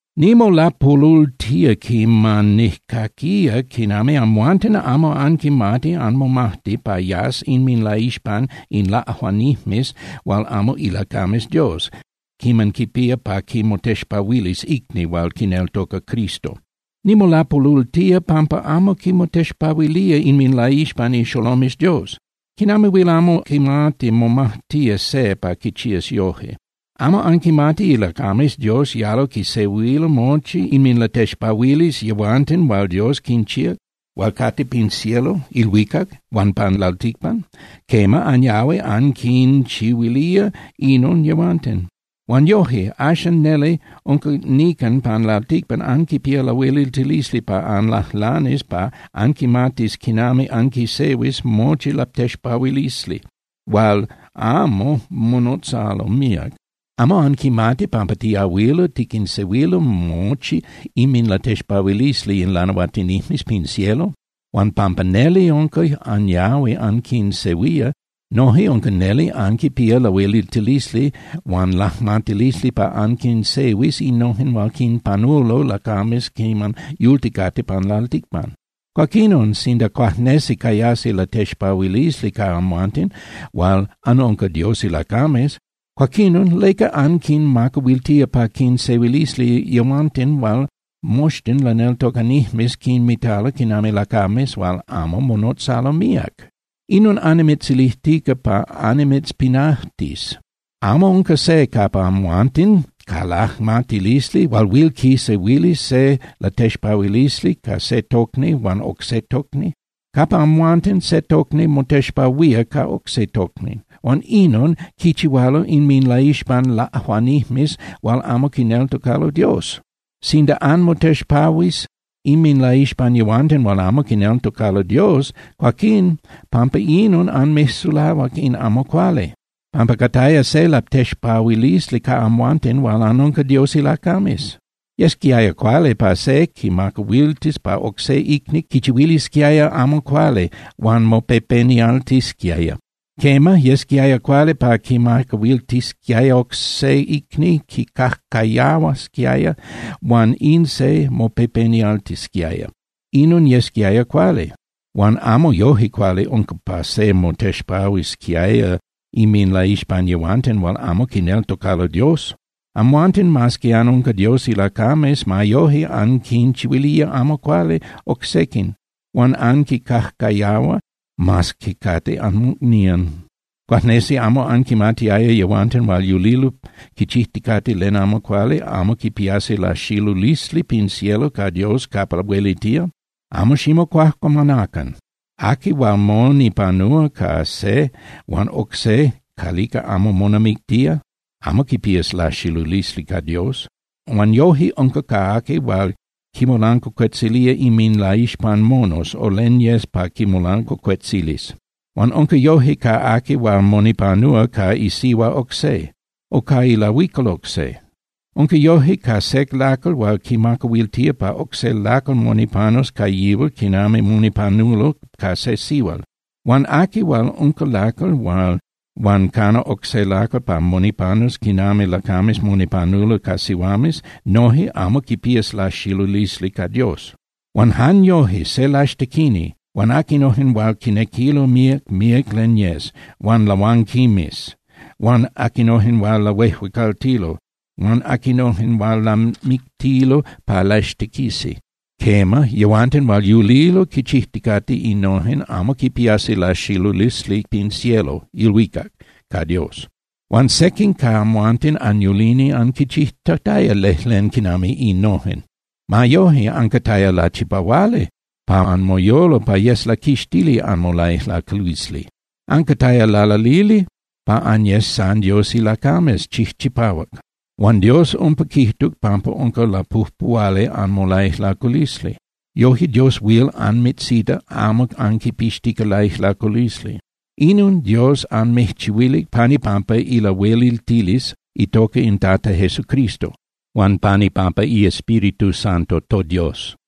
Nimolapolultía quiman nijcaquía quinami amhuanten amo anquimati anmomajti pa yas inminlaixpan in laꞌajuanijmes hual amo ilacames Dios quiman quipía pa quimotexpahuilis icni hual quineltoca Cristo. Nimolapolultía pampa amo quimotexpahuilía inminlaixpan ixolomes Dios. ¿Quinami huil amo quimati momajtía se pa quichías yoje? ¿Amo anquimati ilacames Dios yalo quisehuilo mochi inminlatexpahuilisli yehuanten hual Dios quinchíac hual cate pin cielo (ilhuicac) huan pan lalticpan? Quema, anyahui anquinchihuilía inon yehuanten. Huan yoje, axan neli unca nican pan lalticpan anquipía lahueliltilisli pa anlajlanis pa anquimatis quinami anquisehuis mochi latexpahuilisli hual amo monotzalo míac. ¿Amo anquimati pampa tiahuilo tiquinsehuilo mochi inminlatexpahuilisli in lanahuatinijmes pin cielo? Huan, pampa neli unca anyahui anquinsehuía, noje unca neli anquipía lahueliltilisli huan lajmatilisli pa anquinsehuis innojen hual quinpanulo lacames quiman yulticate pan lalticpan. Cuaquinon, sinda cuajnesi cayasi latexpahuilisli ca amhuanten hual anunca Dios ilacames, cuaquinon ¿leca anquinmacahuiltía pa quinsehuilisi yehuanten hual moxtin laneltocanijmes quinmitalo quinami lacames hual amo monotzalo míac? Inon annimitzilijtica pa annimitzpinajtis. ¿Amo unca se capa amhuanten ca lajmatilisli hual huil quisehuilis se latexpahuilisli ca se tocni huan oc se tocni? Capa amhuanten, se tocni motexpahuía ca oc se tocni, huan ¡inon quichihualo inminlaixpan laꞌajuanijmes hual amo quineltocalo Dios! Sinda anmotexpahuis inminlaixpan yehuanten hual amo quineltocalo Dios, cuaquín pampa inon anmijsulahuac in amo cuali, pampa cataya se latexpahuilisli ca amhuanten hual anunca Dios ilacames. Yesquiaya cuali pa se quimacahuiltis pa oc se icni quichihuilisquiaya amo cuali huan mopepenialtisquiaya. Quema, yesquiaya cuali pa quimacahuiltisquiaya oc se icni quicajcayahuasquiaya huan in se mopepenialtisquiaya. Inon yesquiaya cuali, huan amo yoje cuali unca pa se motexpahuisquiaya inminlaixpan yehuanten hual amo quineltocalo Dios. Amhuanten, mas que anunca Dios ilacames, ma yoje anquinchihuilía amo cuali oc sequin huan anquincajcayahua, mas que cate anmocnían. ¿Cuajnesi amo anquimatiaya yehuanten hual yulilo quichijticate len amo cuali amo quipiasi laxilulisli pin cielo ca Dios capa huelitía? Amo ximocuajcuamanacan. Aqui hual monipanúa ca se huan oc se calica amo monamictía amo quipías laxilulisli ca Dios. Huan yoje unca ca aqui hual quinmolancuacuetzilía inminlaixpan monos o len yes pa quimolancuacuetzilis. Huan unca yoje ca aqui hual monipanúa ca isihua oc se, o ca ilahuical oc se. Unca yoje ca se lacal hual quimacahuiltía pa oc se lacal monipanus ca yihual quinami monipanulo ca se sihual. Huan aqui hual unca lacal huan cana oc se lacal pa monipanus quinami lacames monipanulo ca sihuames noje amo quipias laxilulisli ca Dios. Huan jan yoje, se laxtequini, huan aquinojen hual quinequilo míac, míac len yes, huan lahuanquimes, huan aquinojen hual lahuejuecaltilo, huan aquinojen hual lamictilo pa laxtequisi, quema, yehuanten hual yulilo quichijticate innojen amo quipiasi laxilulisli pin cielo (ilhuicac) ca Dios. Huan sequin ca amhuanten anyulini anquinchijtataya lejlen quinami innojen. Ma yoje, ancataya lachipahuali pa anmoyolo pa yes laquixtili anmolaijlaculisli. Ancataya lalalili pa anyes san Dios ilacames chijchipahuac, huan Dios umpa quijtuc pampa unca lapujpuhuali anmolaijlaculisli. Yoje Dios huil anmitzita amo anquipixtica laijlaculisli. Inon Dios anmijchihuilic pan ipampa ilahueliltilisli itoca in Tata Jesucristo huan pan ipampa iEspíritu Santo toDios.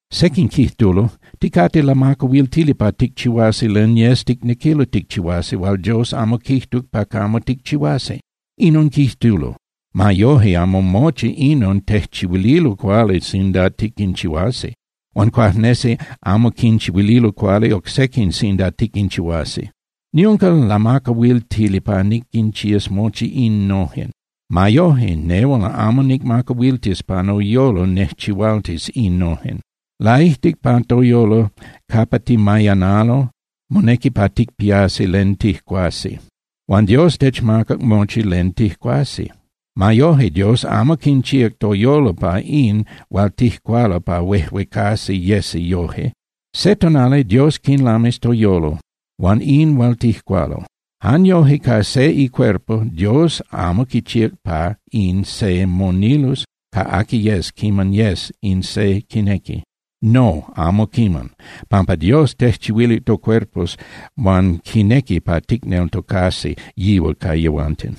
Sequin quijtulo: “Ticate lamacahuiltili pa ticchihuasi len yes ticnequilo ticchihuasi hual Dios amo quijtuc pa camo ticchihuasi.” Inon quijtulo. Ma yoje, amo mochi inon tejchihuililo cuali sinda tiquinchihuasi, huan cuajnesi amo quinchihuililo cuali oc sequin sinda tiquinchihuasi. Niunca lamacahuiltili pa niquinchías mochi innojen. Ma yoje, nehual amo nicmacahuiltis pa noyolo nejchihualtis innojen. Laijtic pa toyolo capa timayanalo, monequi pa ticpiasi len tijcuasi. Huan Dios techmacac mochi len tijcuasi. Ma yoje, Dios amo quinchíac toyolo huan in hual tijcualo pa huejcahuasi yesi yoje. Se tonali Dios quinlamis toyolo huan in hual tijcualo. Jan yoje ca se icuerpo Dios amo quichíac pa in se monilus ca aqui yes quiman yes in se quinequi. No, amo quiman, pampa Dios tejchihuilic tocuerpos huan quinequi pa ticneltocasi yihual ca yehuanten.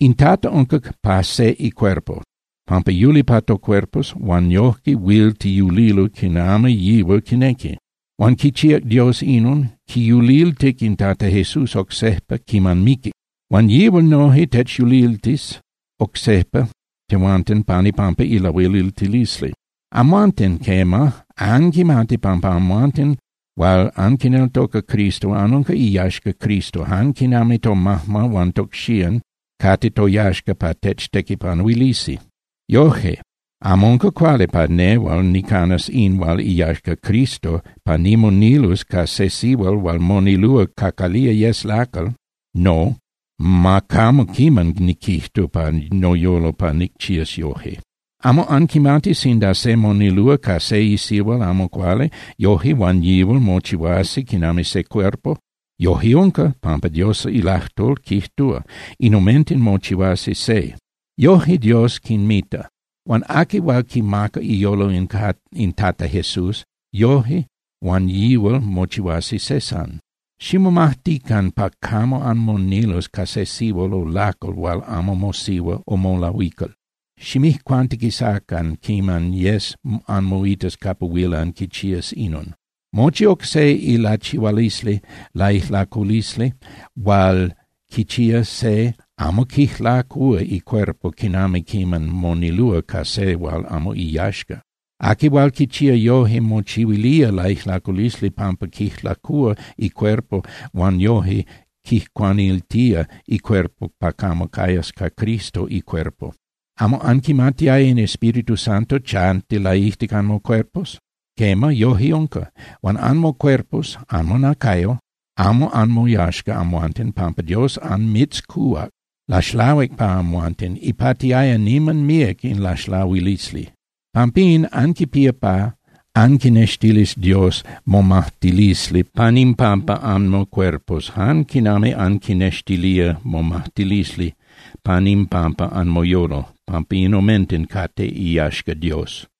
In Tata unca pa se icuerpo, pampa yuli pa tocuerpos huan yojque huil tiyulilo quinami yihual quinequi. Huan quichíac Dios inon, quiyuliltic in Tata Jesús oc sejpa quiman miquic. Huan yihual noje techyuliltis oc sejpa tehuanten pan ipampa ilahueliltilisli. Amhuanten, quema, anquimati pampa amhuanten hual anquineltoca Cristo anunca iyaxca Cristo jan quinami tomajma huan tocxían cate toyaxca pa techtequipanuilisi. Yoje, amo unca cuali pa nehual nicanas in hual iyaxca Cristo pa nimonilus ca se sihual hual monilúa ca calía yes lacal. No, ¡ma camo quiman niquijtu pa noyolo pa nicchías yoje! ¿Amo anquimati sinda se monilúa ca se sihual amo cuali, yoje huan yihual mochihuasi quinami se cuerpo? Yoje unca, pampa Dios ilajtol quijtúa: “In omenten mochihuasi se.” Yoje Dios quinmita. Huan aqui hual quimaca iyolo in Tata Jesús, yoje huan yihual mochihuasi se san. Ximomajtican pa camo anmonilus ca se sihual o lacal hual amo mosihua o molahuical, ximijcuantiquisacan quiman yes anmoitas capa huil anquichías inon. Mochi oc se ilachihualisli laijlaculisli hual quichía se amo quijlacúa icuerpo quinami quiman monilúa ca se hual amo iyaxca. Aqui hual quichía yoje mochihuilía laijlaculisli pampa quijlacúa icuerpo huan yoje quijcuaniltía icuerpo pa camo cayas ca Cristo icuerpo. ¿Amo anquimatiaya in Espíritu Santo chanti laijtic anmocuerpos? Quema, yoje unca, huan anmocuerpos (anmonacayo) amo anmoyaxca amhuanten, pampa Dios anmitzcuhuac. Laxlahuic pa amhuanten, ipatiaya niman míac in laxlahuilisli. Pampín, anquipía pa anquinextilis Dios momajtilisli pan impampa anmocuerpos jan quinami anquinextilía momajtilisli pan impampa anmoyolo, pampa in omenten cate iyaxca Dios.